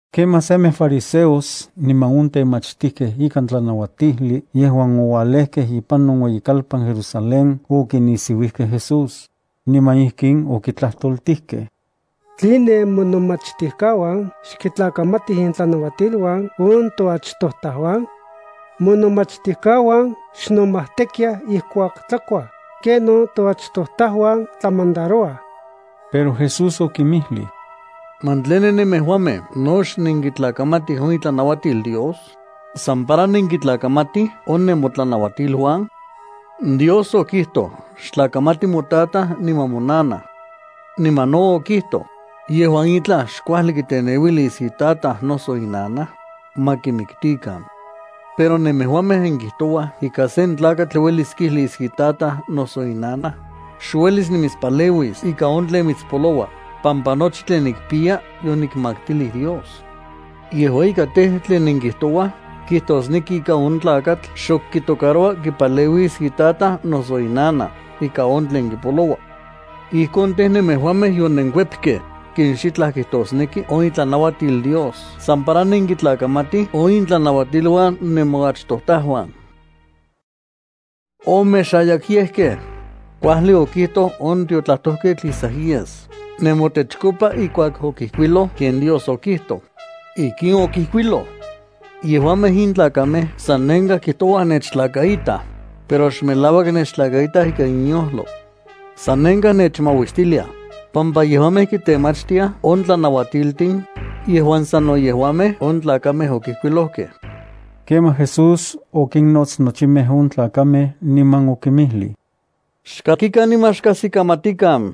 Kemaj semej fariseos niman on temachtijkej ikan tlanauatijli yejuan oualejkej ipan on ueyikalpan Jerusalén okinisiuijkej Jesús, niman ijkin okitlajtoltijkej: —¿Tline monomachtijkauan xkitlakamatij intlanuatiluan on toachtojtajuan? Monomachtijkauan xnomajtekiaj ijkuak tlakuaj ijki kenon toachtojtajuan tlamandarouaj. Pero Jesús okinmijlij: —¿Man tline nemejuamej no xnenkitlakamatij on itlanauatil Dios, san para nenkitlakamatij on nemotlanauatiluan? Dios okijtoj: “Xtlakaita motataj niman monanaj.” Niman no okijtoj: “Yejuan itlaj xkuajli kiteneuilis itataj noso inanaj, ma kimiktikan.” Pero nemejuamej nenkijtouaj ika sen tlakatl uelis kijlis itataj noso inanaj: “Xuelis nimitspaleuis ika on tlen mitspoloua pampa nochi tlen nikpiya yonikmaktilij Dios.” Yejua ika tej, tlen nenkijtouaj kijtosneki ika on tlakatl xok kitocaroua kipaleuis itataj noso inanaj ika on tlen kipoloua. Ijkon tej, nemejuamej yonenkuepkej ken xitlaj kijtosneki on itlanauatil Dios san para nenkitlakamatij on intlanauatiluan nemoachtojtajuan. ¡Omexayakyejkej! Kuajli okijtoj on tiotlajtojketl Isaías nemotechkopa ijkuak okijkuiloj ken Dios okijtoj. Ijkin okijkuiloj: Yejuamej in tlakamej sannenkaj kijtoua nechtlakaitaj, pero xmelauak nechtlakaitaj ikan inyojlo. Sanenkaj nechmauistiliaj, pampa yejuamej kitemachtiaj on tlanauatiltin yejuan sano yejuamej on tlakamej okijkuilojkej. Kemaj Jesús okinnots nochimej on tlakamej, niman okinmijlij: —Xkakikan niman xkajsikamatikan.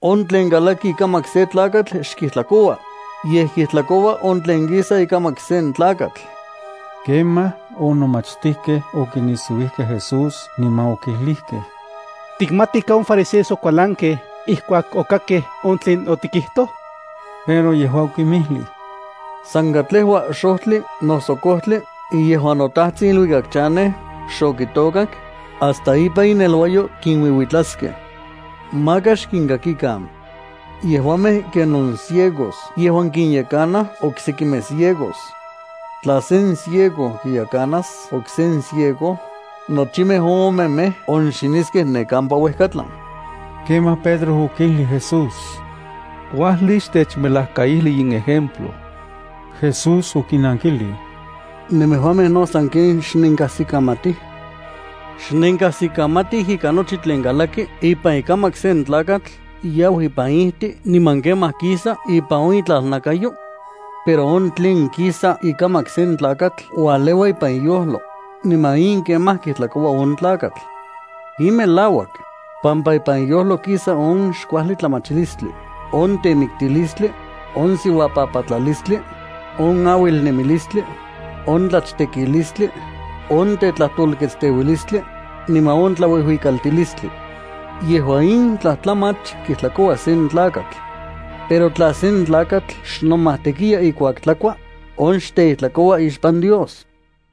On tlen kalaki ikamak sen tlakatl xkijtlakoua, yej kijtlakoua on tlen kisa ikamak sen tlakatl. Kemaj, on nomachtijkej okinisiuijkej Jesús, niman okijlijkej: —¿Tikmati ika on fariseos okualankej ijkuak okakkej on tlen otikijtoj? Pero yejua okinmijlij: —San katlejua xojtli noso kojtli yejuan noTajtsin iluikak chanej xokitôkak, hasta ipan ineluayo kinuiuitlaskej. Maka xkinkakikan. Yejuamej ken on ciegos yejuan kinyekanaj oksekimej ciegos. Tla sen ciego kiyekanas okse ciego, nochimej on omemej onxiniskej ne kampa uejkatlan. Kemaj Pedro okijlij Jesús: —Kuajli xtechmelajkaijli in ejemplo. Jesús okinankijlij: —¿Nemejuamej no sanken xnenkajsikamatij? ¿Xnenkajsikamatij ika nochi tlen kalaki ipan ikamak sen tlakatl yau ipan ijti niman kemaj kisa ipan on itlalnakayo? Pero on tlen kisa ikamak sen tlakatl ualeua ipan iyojlo, niman in kemaj kijtlakoua on tlakatl. In melauak, pampa ipan iyojlo kisa on xkuajli tlamachilistli, on temiktilistli, on siuapapatlalistli, on auilnemilistli, on tlachtekilistli, on tetlajtolkatsteuilistli, niman on tlauijuikaltilistli. Yejua in tlajtlamach kijtlakoua sen tlakatl. Pero tla sen tlakatl xnomajtekiya ijkuak tlakua, on xteijtlakoua ixpan Dios.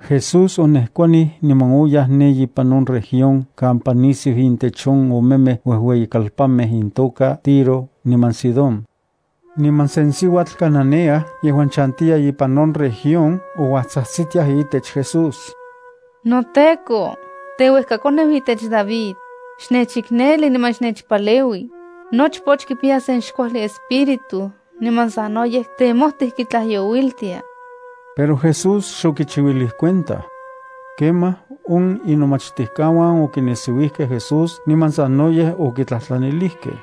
Jesús onejkuanij niman oyaj ne ipan on región kampa nisiu intech on omemej uejueyikalpanmej intoka Tiro niman Sidón. Niman sen siuatl Cananea yejuan chantiya ipan on región ouajtsajtsitiaj itech Jesús: —¡NoTEKO, teuejkakoneu itech David, xnechikneli niman xnechpaleui! Nochpoch kipiya sen xkuajli espíritu niman sanoyej temojtij kitlajyouiltia. Pero Jesús xokichiuilij cuenta. Kemaj on inomachtijkauan okinisiuijkej Jesús niman sanoyej okitlajtlanilijkej: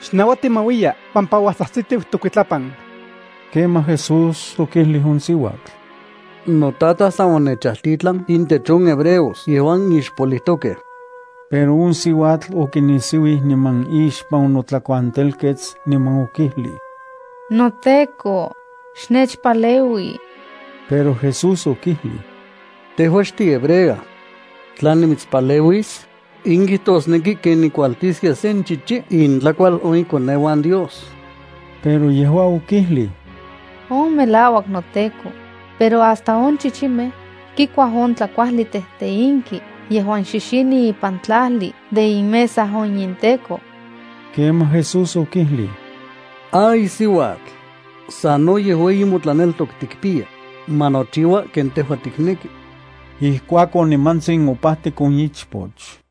—Xnauati ma uiya pampa uajtsajtsitiu tokuitlapan. Kemaj, Jesús okijlij on siuatl: —NoTataj san onechajtitlan intech on hebreos yejuan ixpolijtokej. Pero on siuatl okinisiuij niman ixpan onotlakuantelkets, niman okijlij: —¡NoTEKO, xnechpaleui! Pero Jesús okijlij: —Tejua xtihebrea. Tla nimitspaleuis, in kijtosneki ken nikualtiskia sen chichi intlakual on ikoneuan Dios. Pero yejua okijlij: —On melauak noTEKO, pero hasta on chichimej kikuaj on tlakuajli tejteinki yejuan xixini ipan tlajli de inmesa on inteko. Kemaj Jesús okijlij: —¡Ay siuatl, sanoyej ueyi motlaneltok tikpiya! Ma nochiua ken tejua tikneki. Ijkuakon, nimantsin opajtik on ichpoch.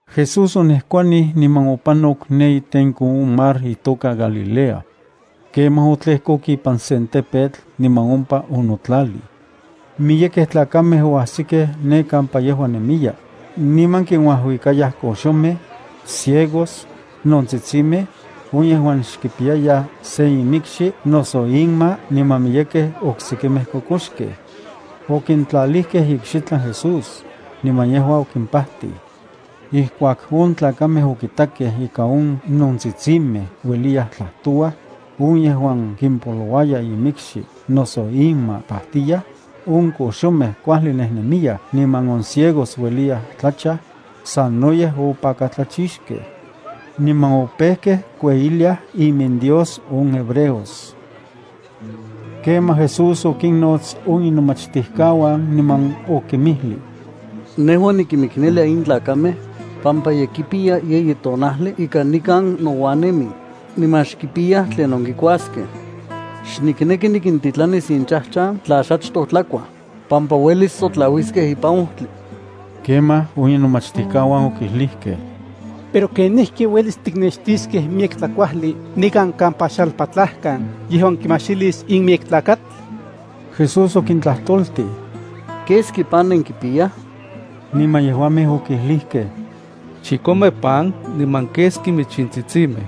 Jesús onejkuanij niman opanok ne itenko on mar itoka Galilea. Kemaj otlejkok ipan sen tepetl niman ompa onotlalij. Miyekej tlakamej oajsikej ne kampa yejua nemiya, niman kinuajuikayaj koxomej, ciegos, nontsitsinmej, on yejuan xkipiyayaj se imikxi noso inma niman miyekej oksekimej kokoxkej. Okintlalijkej ikxitlan Jesús, niman yejua okimpajtij. Ijkuak on tlakamej okitakej ika on nontsitsintin ueliyaj tlajtouaj, on yejuan kimpolouaya imikxi noso inma pajtiyaj, on koxomej kuajli nejnemiyaj niman on ciegos ueliyaj tlachaj, sanoyej opakatlachixkej. Niman opejkej kueyiliaj iminDios on hebreos. Kemaj Jesús okinnots on inomachtijkauan niman okinmijlij: —Nejua nikimiknelia in tlakamej, pampa ye kipiya yeyi tonajli ika nikan nouan nemij niman xkipiyaj tlinon kikuaskej. Xnikneki nikintitlanis inchajchan tla xachtoj tlakuaj, pampa uelis sotlauiskej ipan ojtli. Kemaj, on inomachtijkauan okijlijkej: —Pero ¿kenijki uelis tiknextiskej miyek tlakuajli nikan kampa xalpatlajkan yejuan kimajxilis in miyek tlakatl? Jesús okintlajtoltij: —¿Keski pan nenkipiyaj? Niman yejuamej okijlijkej: —Chikome pan niman keski michintsitsimej.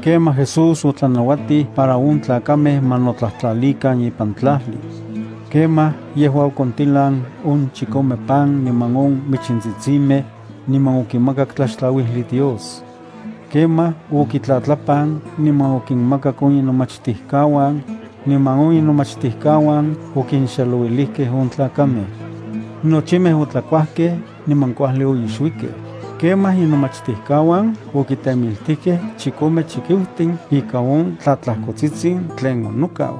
Kemaj Jesús otlanauatij para on tlakamej ma notlajtlalikan ipan tlajli. Kemaj yejua okontilan on chikome pan niman on michintsitsimej, niman okimakak tlaxtlauijli Dios. Kemaj okitlatlapan niman okinmakak on inomachtijkauan, niman on inomachtijkauan okinxelouilijkej on tlakamej. Nochimej otlakuajkej, niman kuajli oixuikej. Kemaj inomachtijkauan okitemiltijkej chikome chikiutin ika on tlatlajkotsitsin tlen onokau.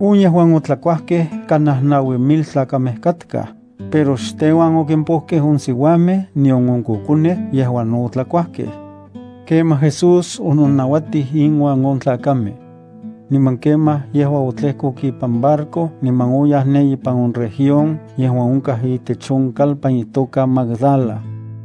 On yejuan otlakuajkej kanaj naui mil tlakamej katkaj, pero xteuan okimpojkej on siuamej nion on kokonej yejuan no otlakuajkej. Kemaj Jesús ononajnauatij inuan on tlakamej. Niman kemaj yejua otlejkok ipan barco niman oyaj ne ipan on región yejuan onkaj itech on kalpan itoka Magdala.